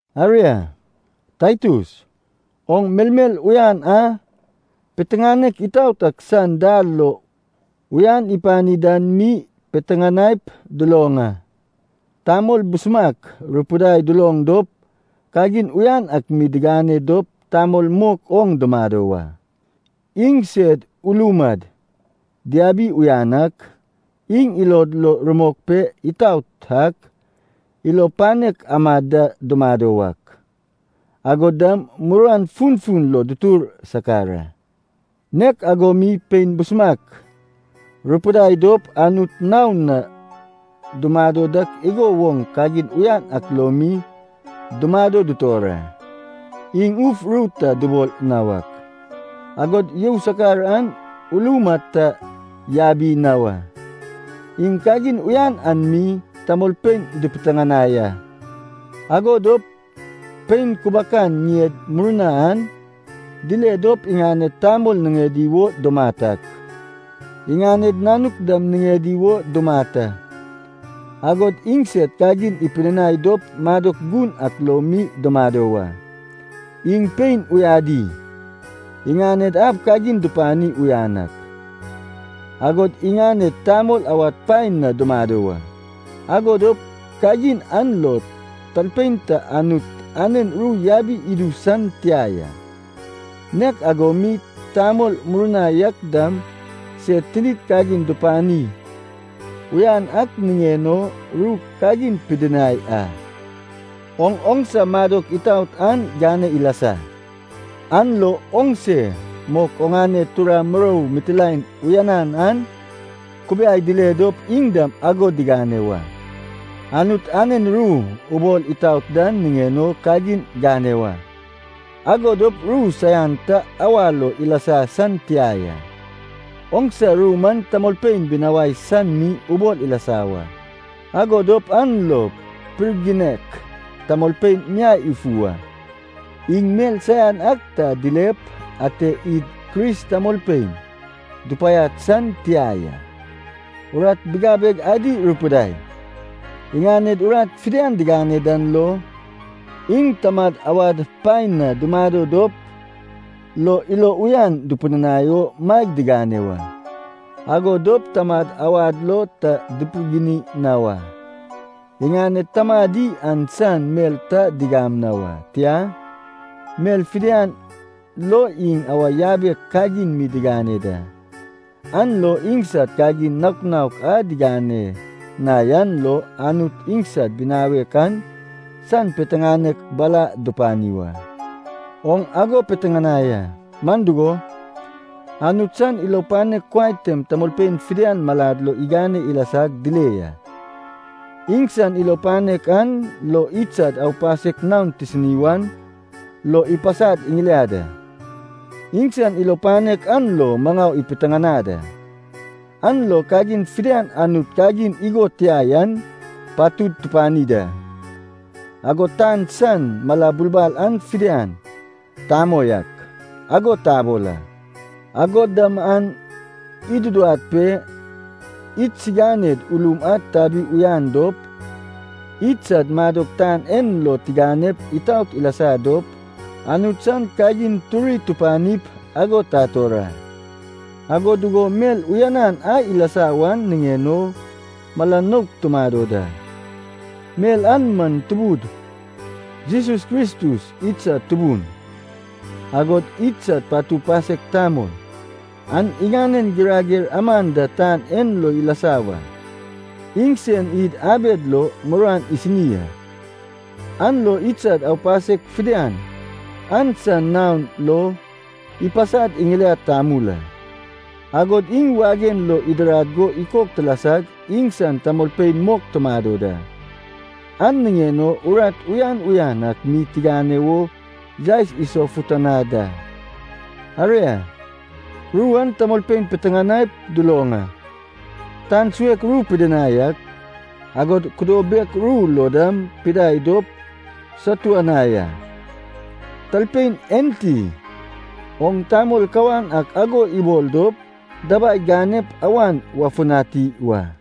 Aria, Taitus, oŋ melmel uyan a piteŋanek itaot ak san dal lo uyan ipani dan mi piteŋanaip duloŋ a. Tamol busumak rupidai duloŋ dop kagin uyan ak mi digane dop tamol mok oŋ dumado wa. Iŋsed ulum ad diabi uyan ak, iŋ ilod lo rumok pe itaot ak, ilo panek amad da dumado wak, agod dam muruan funfun lo dutur sakar a. Nek ago mi pein busumak rupidai dop Anut naon na dumado dak igo woŋ kagin uyan ak lo mi dumado dutor a. Iŋ uf ru ta dubol na wak, agod you sakar an ulum ad ta yabi na wa. Iŋ kagin uyan an mi tamolpein dupiteŋanai a. Ago dop pein kubakan ŋied murna an dile dop iŋaned tamol niŋedi wo dumat ak, iŋaned nanuk dam niŋedi wo dumat a. Agod iŋsed kagin ipidinai dop madok gun ak lo mi dumado wa. Iŋ pein uyadi, iŋaned ab kagin dupani uyan ak, agod iŋaned tamol awad paen na dumado wa. Ago dop kagin an lo talpein ta Anut anen ru yabi idu san tia ya. Nek ago mi tamol murna yak dam sed tinid kagin dupani uyan ak niŋen o ru kagin pidinai a. Oŋ oŋsa madok itaot an gane ilasa, an lo oŋse mok oŋane tura murou mitilaen uyanan an kubiai dile dop iŋ dam ago digane wa. Anut anen ru ubol itaot dan niŋen o kagin gane wa, ago dop ru saian ta awa lo ilasa san tia ya. Oŋsa ru man tamolpein ibinawai san mi ubol ilasa wa, ago dop an lo pirginek tamolpein miai ifu wa. Iŋ mel saian ak ta dilep ate id Kris tamolpein dupaiad san tia ya. Urat bigabeg adi rupidai, iŋaned urat fidian digane dan lo, iŋ tamad awad paen na dumado dop lo ilo uyan dupidinai o maeg digane wa, ago dop tamad awad lo ta dipirgini na wa. Iŋaned tamadi an san mel ta digam na wa. Tia, mel fidian lo iŋ awa yabek kagin mi digane da. An lo iŋsad kagin naok naok a digane na yan lo Anut idsad binawek an san piteŋanek bala dupani wa. Oŋ ago piteŋanai a, man dugo, Anut san ilo panek kuai tem tamolpein fidian malad lo igane ilasag dile ya. Iŋsan ilo panek an lo idsad aupasek naon tisini wan lo ipasad iŋiliad a. Iŋsan ilo panek an lo maŋau ipiteŋanad a, an lo kagin fidian a Anut kagin igo tia yan patud tupani da, agod tan san mala bulbal an fidian “tamoi ak” ago tabol a. Agod dam an iduduwad pe idsiŋaned ulum ad tabi uyan dop, idsad madok tan en lo tiganep itaot ilasa dop, Anut san kagin turi tupanip ago tator a. Ago dugo mel uyanan a ilasa wan niŋen o mala nouk tumado da, mel an man Tubud Jesus Kristus idsad Tubun, agod idsad Patu Pasek tamol, an iŋanen girager aman da tan en lo ilasa wa. Iŋsen id abed lo muruan isini a, an lo idsad aupasek fidian an san naon lo ipasad iŋiliad tamul a. Agod iŋ wagen lo idirad go ikok tilasag iŋsan tamolpein mok tumado da. An niŋen o urat uyan uyan ak mi tigane wo yaes isofutanad a. Aria, ru an tamolpein piteŋanaip duloŋ a. Tan suek ru pidinai ak, agod kudo bek ru lo dam pidai dop satuanai a. Talpein enti oŋ tamol kawan ak ago ibol dop dabai ganep awan wafutani wa.